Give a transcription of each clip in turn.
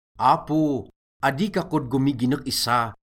Apo, adi ka kod gomiginek issa,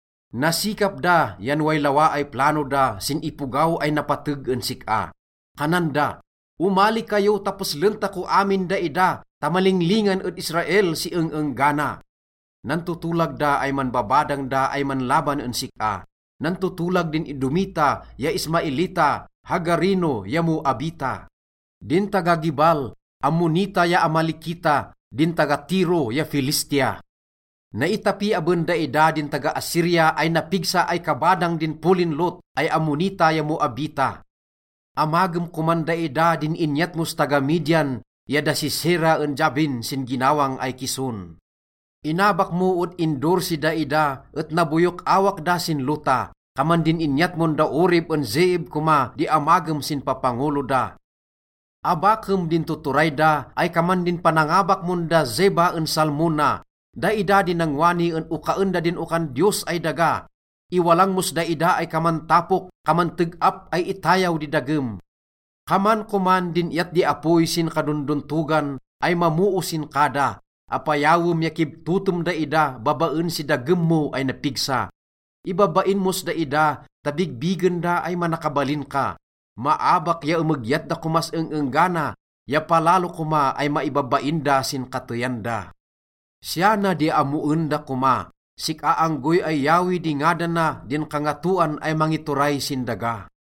Nasikap da yan way lawa ay plano da sin ipogaw ay napateg en sik-a. Kanan da, “Omali kayo ta peslen tako amin daida ta malinglingan ed Israel si eng-enggana.” Nantotolag da ay manbabadang da ay manlaban en sik-a. Nantotolag din Edomita ya Ismaelita, Hagareno ya Moabita, din taga-Gebal, Ammonita ya Amalekita, din taga-Tiro ya Filistia. Naitapi aben daida din taga-Assyria ay napigsa ay kabadang din polin Lot ay Ammonita ya Moabita. Amagem koman daida din inyat mos taga-Midian ya da Sisera en Jabin sin ginawang ay Kison. Inabak mo ed Endor si daida et naboyok awak da sin lota. Kaman din inyat mon da Oreb en Zeeb koma di amagem sin papangolo da. Abakem din tuturay da ay kaman din panangabak mon da Zeba en Zalmunna. Daida din nangwani en okaen da din okan Diyos ay daga. Iwalang mos daida ay kaman tapok, kaman teg-ap ay itayaw di dagem. Kaman koman din iyat di apoy sin kadondontogan ay mamoo sin kada, apayawem ya kibtotem daida babaen si dagem mo ay napigsa. Ibabain mos daida ta bigbigen da ay manakabalin ka. Maabak ya emegyat da komas eng-enggana ya palalo koma ay maibabain da sin kateyan da. Siya na di ammoen da koma: sik-a anggoy ay Yahweh di ngadana din kangatoan ay mangituray sin daga.